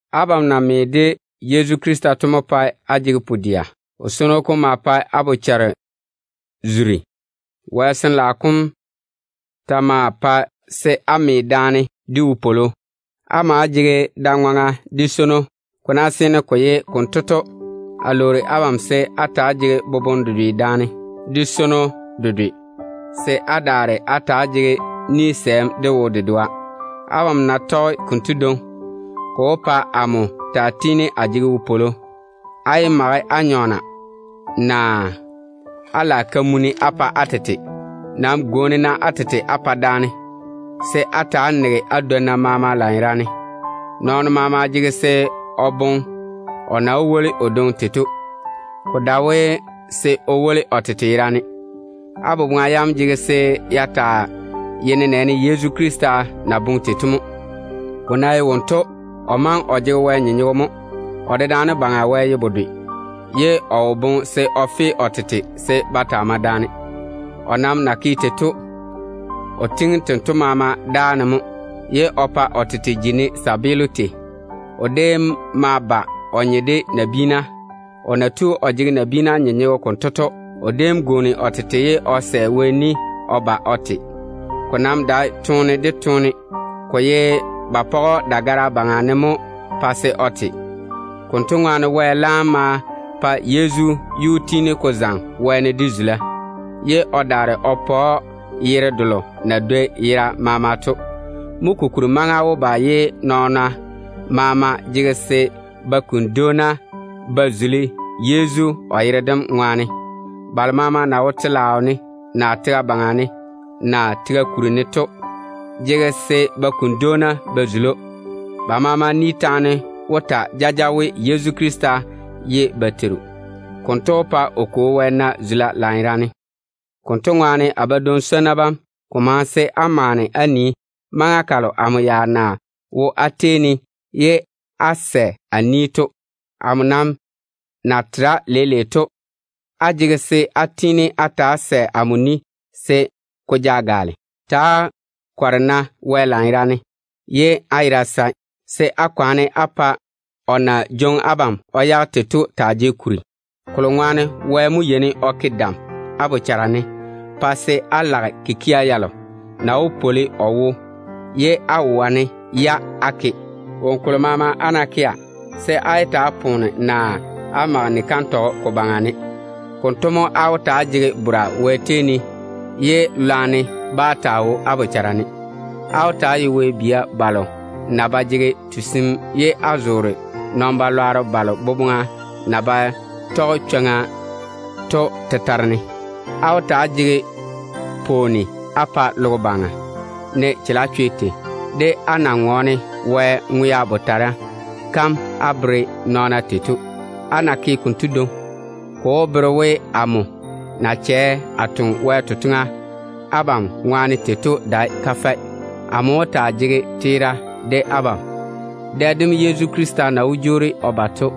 Abam na me de Yezu Krista to mo pae á jege pu-dɛa. O swono kom maa pae á bochara zuri. Wɛ Sin-laao kom ta maa pae se á me daane de wopwolo. Á maa jege da-ŋwaŋa de swono. Ko na seene ko ye konto to, a lwoori abam se á ta‑á jege boboŋe dedwe daane, de swono bedwe, se á daare á ta‑á jege ni-sɛɛm á pa daane. Abam ná ke á tɔge konto dwoŋi, ko wó pa amo tiini a taa jege wopwolo. Á yé mage á nyɔɔna naa á lage kamunim á pa á tete. Nam gwooni-na á tete á pa daane, se á ta‑á nege á dwonna maama lanyerane. Nɔɔno maama jege se o boŋe o nii o na wó woli o dwoŋi tei to, ko dae we se o woli o tete yerane. Á boboŋa yam jege se ya taa ye nenɛɛne Yezu Krista na boŋe tei to mo. Ko ná ye wonto, o maŋe o jege Wɛ nyenyego mo. O dedaane Baŋa Wɛ ye bedwe, ye o wo ke o boboŋa ne se o fe o tete se ba taa mae daane. O nam na ke tei to, o tiŋi tento maama dáa ne mo, ye o pa o tete ji ne kabaa tei. O déem ma ba o nye de nabiina. O na tu o jege nabiina nyenyego konto to, o déem tu o tete ye o sɛ Wɛ ni o ba o te. Ko nam dae toone de toone, ko ye ba page‑o dagara yuu ne mo pa se o te. Konto ŋwaane Wɛ laam ma zeiŋi Yezu yuu wɛ-wɛ de zula, ye o daare o pa‑o yere delo na dwoi yera maama to. Mo kokuri maŋa wó ba se nɔɔna maama kuni dwoona ba zuli Yezu o yere-zɔŋɔ kom ŋwaane. Balo na wo telaao ne, naa tega baŋa ne, naa tega kuri ne to maama jege se ba kuni nadwoona mo ba zuli‑o. Ba maama ni taane wó ta jaja we, Yezu Krista ye ba Teiru. Konto wó pa dé Kwo Wɛ na zula lanyerane. Konto ŋwaane, a badwoŋ-swonnu bam, ko maŋe se á maane á nii maŋa kalo amo ya na wo á tei ne ye á sɛ amo ni to. Amo nam na tera leile to, á jege se á tiini á ta‑á sɛ amo ni se ko ja gaale. Ta‑á kɔre-na Wɛ lanyerane ye á yera sae, se á kwaane á pa o na jwoŋi abam o yage tei to ja kuri lanyerane. Kolo ŋwaane Wɛ mo yeini o ke dam á bochara ne, pa se á lage kikia yalo na wó su o yi ye á wane-ya á ke. Woŋo kolo maama á na kea, se á yé ta‑á poona, naa á mage ni-kantɔgɔ ko baŋa ne. Konto mo á wó ta‑á jege chega Wɛ tei ne, ye lwarem bá taa wo á bochara ne. Á wó ta‑á ye Wɛ bia balo na ba jege tusim ye á zoore nɔn-balwaaro balo boboŋa na ba tɔge chwoŋa to tetare ne. Á wó ta‑á jege pwooni á pa logo baŋa, ne chalechwe tei, de á na ŋɔɔne Wɛ ŋwea botara kam á bere nɔɔna tei to. Á ná ke konto dwoŋi, ko wó bere we, amo na chɛ a toŋe Wɛ totoŋa abam ŋwaane tei to dae kafɛ. Amo wó taa jege teera de abam, dɛ dem Yezu Krista na wó jwoori o ba to.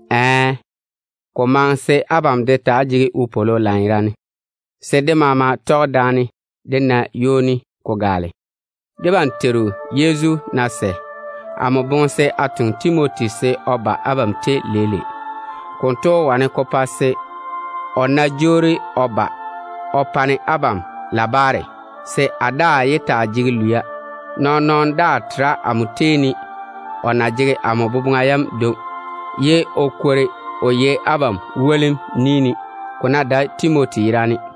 Ɛɛ, ko maŋe se abam de taa jege wopwolo lanyerane, se dé maama tɔge daane dé na ywoni dedɛ. Debam Teiru Yezu ná sɛ, amo boŋe se a toŋe Timoti se o ba abam tei leile. Konto wó wane ko pa se, o ná jwoori o ba o pa-ne abam labaare, se a daa yé taa jege lwia a pa abam. Nɔɔn-nɔɔno daa tera amo tei ne o na jege amo boboŋa yam dwoŋi, ye o yiga wo abam wone, ko ná dae Timoti yerane.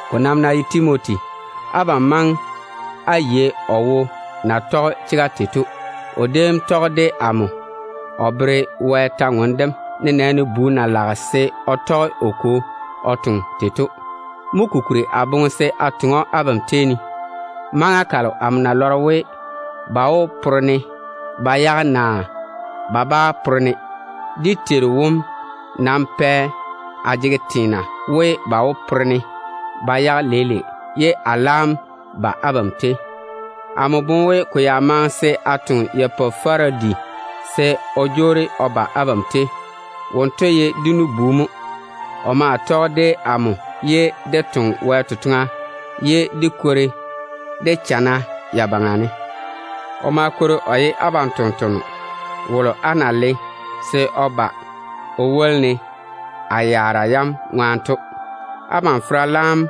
Ko nam ná ye Timoti, abam maŋe á yei o wo na tɔge chega tei to. O déem tɔge de amo o tɔɔle Wɛ kwor-ywoŋa kam, nenɛɛne bu na lage se o tɔge o kwo o toŋe tei to. Mo kokuri a boŋe se a toŋe‑o abam tei ne, ne amo ná lɔre we, ba wó pore-ne ba yage, naa ba bá pore-ne. Dé Teiru wom nam pɛ a jege teena we, ba wó pore-ne ba yage leile ye a laam ba abam tei. Amo boŋe we ko ya maŋe se a toŋe Epafarodi se o jwoori o ba abam tei. Wonto ye dé nu-bu mo. O ma tɔge de amo o toŋe Wɛ totoŋa, ye dé kwori dé chana ya baŋa ne. O maa ye abam tontoŋeno wolo á na le á wone se o ba o woli-ne a yaara yam ŋwaane to. Abam fera laam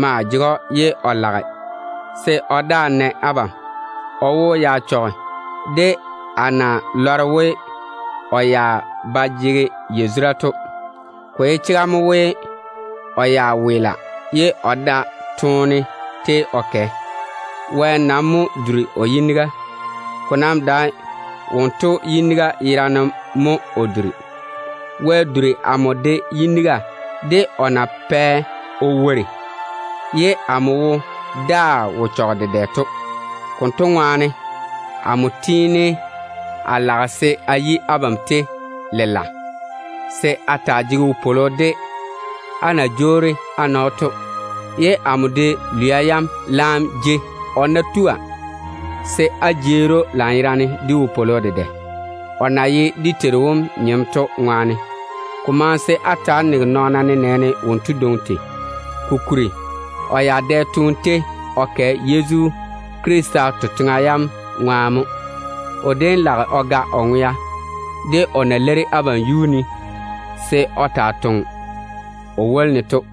maa jege‑o, ye o lage se o daa na abam. O wo ya chɔge de á na lɔre we, o ya ba jege yazura to. Ko ye chega mo we, o ya weela ye o da toone tei o kɛ. Wɛ nam mo duri o yiniga. Ko nam dae wonto yiniga yerane mo o duri. Wɛ duri amo de yiniga, de o na pɛ o wori ye amo wo daa wo tiini ko chɔge ko daŋe da-baŋa ne to. Konto ŋwaane, amo yɔɔre a lage se o yi abam tei lela, se á ta‑á jege wopwolo de á na jwoori á na‑o to, ye amo de lwia yam laam jei. O ná tua, se á jeeri‑o lanyerane de wopwolo dedɛ, o na ye dé Teiru wom nyem to ŋwaane. Ko maŋe se á ta‑á nege nɔɔna nenɛɛne wonto dwoŋi tei. Kokuri o ya dɛ toone tei o kɛ Yezu Krista totoŋa yam ŋwaane mo. O déem lage o ga o ŋwea de o na leiri abam yuu ne se o taa toŋa o woli-ne to.